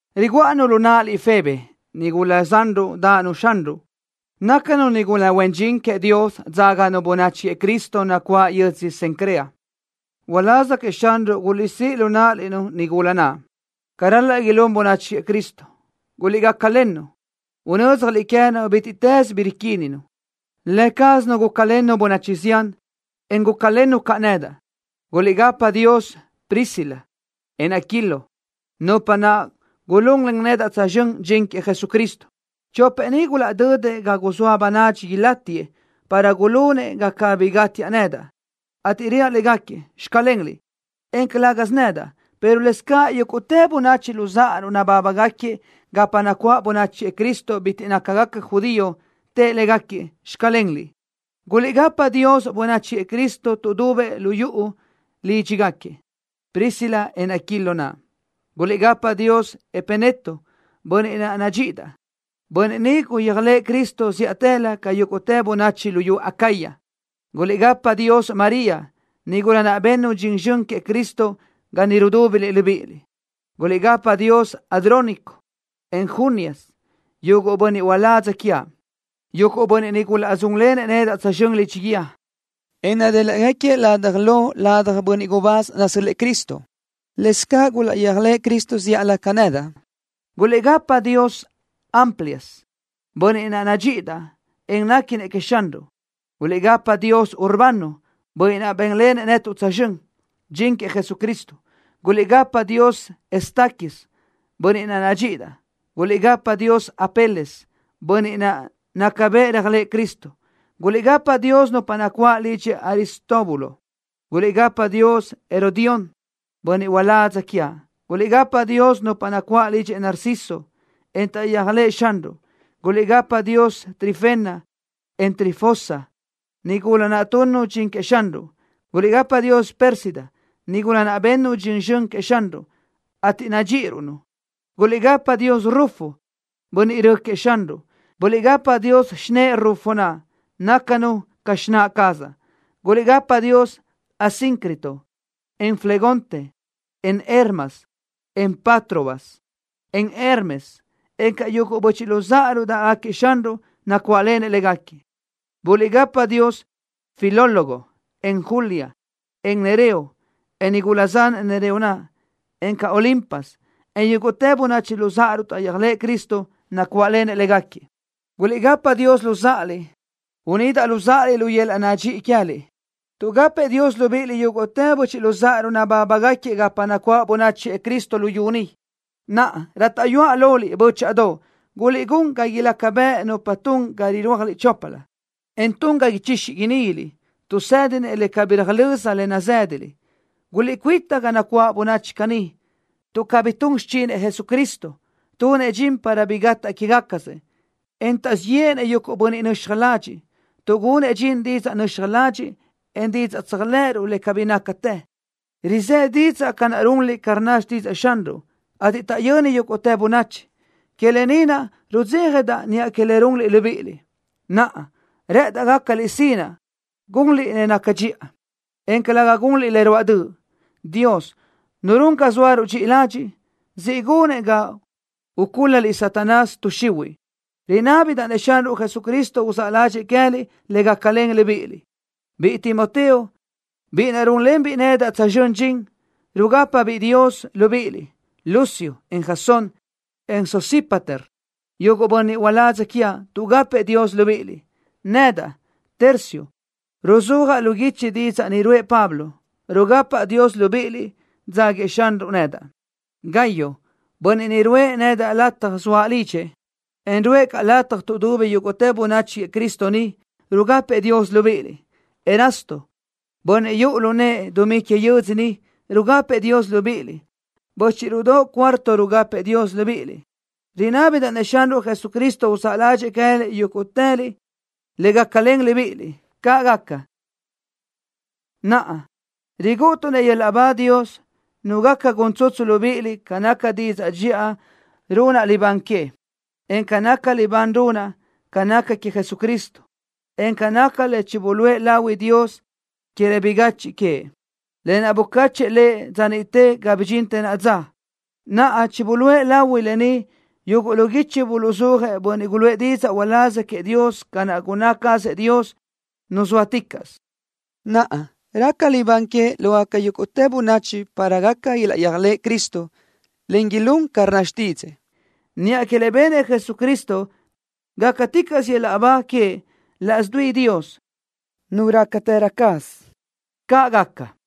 Riguʼa-nu lu náʼaliʼ Febe, nigula zanruʼ dáʼanu Xanruʼ. Nácanu nigula huen dxin queëʼ Dios dzáganu bönachi queëʼ Cristo nacuáʼ yödzö Cencrea. Uláz queëʼ Xanruʼ guliʼsíʼ lu náʼaliʼ-nu nigula naʼ, ca ral-laʼ ilún bönachi queëʼ Cristo. Guliʼgácalen lënu, unö́dzjaliʼ queë́nu bítiʼtës bi riquínnu. Lë cázanu gúcalennu bönachi zián, en gúcalennu caʼ nedaʼ. Guliʼgapa Dios Priscila, en Aquilo, nupa naʼ gulunlen nedaʼ tsözxö́n dxin queëʼ Jesucristo. Chopëʼ ni gulaʼdödëʼ ga guzóa bönadxi ilátiëʼ para gulunëʼ ga cabí gátiaʼ nedaʼ, ateʼ reaʼ légaquiëʼ: “Xclenliʼ”, en calë́gasö nedaʼ, pero lëscaʼ yúguʼtë böchiʼ luzáʼaruʼ nabábagaquiëʼ gapa nacuáʼ bönachi queëʼ Cristo bitiʼ nácagaca judío, tëʼë légaquiëʼ: “Xclenliʼ.” Guliʼgapa Dios bönachi queëʼ Cristo tuʼdubëʼ lu yuʼu lídxigaquiëʼ Priscila, en Aquilo naʼ. Guliʼgapa Dios Epeneto, bönniʼ naʼ nadxíʼidaʼ. Bönniʼ ni guyéajlëʼë Cristo zíʼatëlö ca yúguʼtë bönachi luyú Acaya. Guliʼgapa Dios María, nigula naʼ bennu dxin zxön queëʼ Cristo ga niʼ rudúbiliʼ libíʼiliʼ. Guliʼgapa Dios Andrónico, en Junias, yuguʼ bönniʼ uládz quiaʼ. Yuguʼ bönniʼ ni gulaʼdzúnlenëʼ nedaʼ tsözxö́n lidxi guíë, en nadéliʼgaquiëʼ lataj lo ladaj bönniʼ gubáz nasö́l-lëʼë Cristo. Lëscaʼ gulaʼyéajlëʼë Cristo zíʼalö ca nedaʼ. Guliʼgapa Dios Amplias, bönniʼ naʼ nadxíʼidaʼ, en néquinëʼ queëʼ Xanruʼ. Guliʼgapa Dios Urbano, bönniʼ naʼ bénlenëʼ netuʼ tsözxö́n dxin queëʼ Jesucristo. Guliʼgapa Dios Estaquis, bönniʼ naʼ nadxíʼidaʼ. Guliʼgapa Dios Apeles, bönniʼ naʼ naca bëʼ réajlëʼë Cristo. Guliʼgapa Dios nupa nacuáʼ lidxëʼ Aristóbulo. Guliʼgapa Dios Herodión, bönniʼ uládz quiaʼ. Guliʼgapa Dios nupa nacuáʼ lidxëʼ Narciso, en taʼyéajlëʼë Xanruʼ. Guliʼgapa Dios Trifena, en Trifosa, nigula naʼ tunnu dxin queëʼ Xanruʼ. Guliʼgapa Dios Pérsida, nigula naʼ bennu dxin zxön queëʼ Xanruʼ, ateʼ nadxíʼiruʼ-nu. Guliʼgapa Dios Rufo, bönniʼ rö queëʼ Xanruʼ. Guliʼgapa Dios xinë́ʼë Rufo naʼ, nácanu caʼ ca xináʼ cazaʼ. Guliʼgapa Dios Asíncrito, en Flegonte, en Hermas, en Patrobas, en Hermes, encaʼ yuguʼ böchiʼ luzáʼaruʼ dáʼgaquiëʼ Xanruʼ, nacuáʼlenëʼ légaquiëʼ. Guliʼgapa Dios Filólogo, en Julia, en Nereo, en nigula zanëʼ Nereo naʼ, encaʼ Olimpas, en yúguʼtë böchiʼ luzáʼaruʼ taʼyéajlëʼë Cristo, nacuáʼlenëʼ légaquiëʼ. Guliʼgapa Dios luzáʼaliʼ, unídaʼliʼ luzáʼaliʼ lu yöl-laʼ nadxíʼi queë́liʼ. Tuʼgapëʼ Dios libíʼiliʼ yúguʼtë böchiʼ luzáʼaruʼ nabábagaquiëʼ gapa nacuáʼ bönachi queëʼ Cristo luyú ni. Naʼa, rátaʼyuaʼ loliʼ, bö́chaʼadoʼ, guliʼgún ga ilaca bëʼ nupa tun ga irúajliʼ choplö, en tun ga ichixi iníguiliʼ, tuʼ tuʼsë́dinëʼ le cabí röjlö́z le nazë́daliʼ. Guliʼcuíta ga nacuáʼ bönachi caní tuʼ cabí tun xichinëʼ Jesucristo. Tunëʼ dxin para bi gataʼ quégacasëʼ, en taʼzíʼ yéʼenëʼ yuguʼ bönniʼ nöxaj ladxiʼ, tuʼgunëʼ dxin didzaʼ nöxaj ladxiʼ, en didzaʼ tséajlëʼëruʼ le cabí nácatë. Rizë́ didzaʼ ca naʼ runliʼ ca rnna xtídzëʼë Xanruʼ, ateʼ taʼyöni yúguʼtë bönachi. Que lë ni naʼ rudzéjadaʼ niʼa que le runliʼ libíʼiliʼ. Naʼa, rë́ʼëndaʼ gácaliʼ sinaʼ gunliʼ le naca dxiʼa, en calëga gunliʼ le ruáʼ döʼ. Dios, Nu run ga zóaruʼ dxi ladxiʼ, siʼ gunëʼ ga ucúl-laliʼ Satanás, tuʼ xihuiʼ. Rinábidaʼ-nëʼ Xanruʼ Jesucristo uzáʼ ládxëʼë queë́liʼ le gácalen libíʼiliʼ. Biʼi Timoteo, biʼi naʼ rúnlenbiʼ nedaʼ tsözxö́n dxin, rugápabiʼ Dios libíʼiliʼ. Lucio, en Jasón, en Sosípater, yuguʼ bönniʼ uládz quiaʼ, tuʼgapëʼ Dios libíʼiliʼ. Nedaʼ, Tercio, ruzúajaʼ lu guichi didzaʼ ni ruʼë Pablo, rugapaʼ Dios libíʼiliʼ, dzáguiëʼ Xanruʼ nedaʼ. Gayo, bönniʼ ni ruʼë nedaʼ lataj zoaʼ lidxëʼ, en ruʼë caʼ lataj tuʼdubi yúguʼtë bönachi queëʼ Cristo ni, rugapëʼ Dios libíʼiliʼ. Erasto, bönniʼ yuʼu lu nëʼë dumí que yödzö ni, rugapëʼ Dios libíʼiliʼ. Bö́chiʼruʼdoʼ Cuarto rugapëʼ Dios libíʼiliʼ. Rinábidaʼ-nëʼ Xanruʼ Jesucristo uzáʼ ládxëʼë queë́liʼ yúguʼtëliʼ le gácalen libíʼiliʼ. ¡Caʼ gaca! Naʼa, rigúʼutuʼ-nëʼ yöl-laʼ ba Dios, Nu gaca gun tsutsu libíʼiliʼ ca naca didzaʼ dxiʼa runaʼ libán que, en ca naca libán runaʼ ca naca queëʼ Jesucristo, en ca naca le chibuluʼë lahui Dios que le bigachiʼ queëʼ, lë naʼ bucáchëʼë Lëʼ dza niʼte ga bidxintë naʼa dza. Naʼa chibuluʼë lahui lë ni yuguʼ lu guichi buluʼzúajëʼ bönniʼ guluʼë didzaʼ uláz queëʼ Dios ca naʼ gunná cazëʼ Dios, Nu zóaticaʼsö. Naʼa raca libán que lógaca yúguʼtë bönachi para gaca ilaʼyéajlëʼ Cristo, en ilún ca rnna xtídzëʼë. ¡Niʼa que le benëʼ Jesucristo, gácaticaʼsö yöl-laʼ ba queëʼ laʼs dui Dios, Nu rácatërö caz! ¡Caʼ gaca!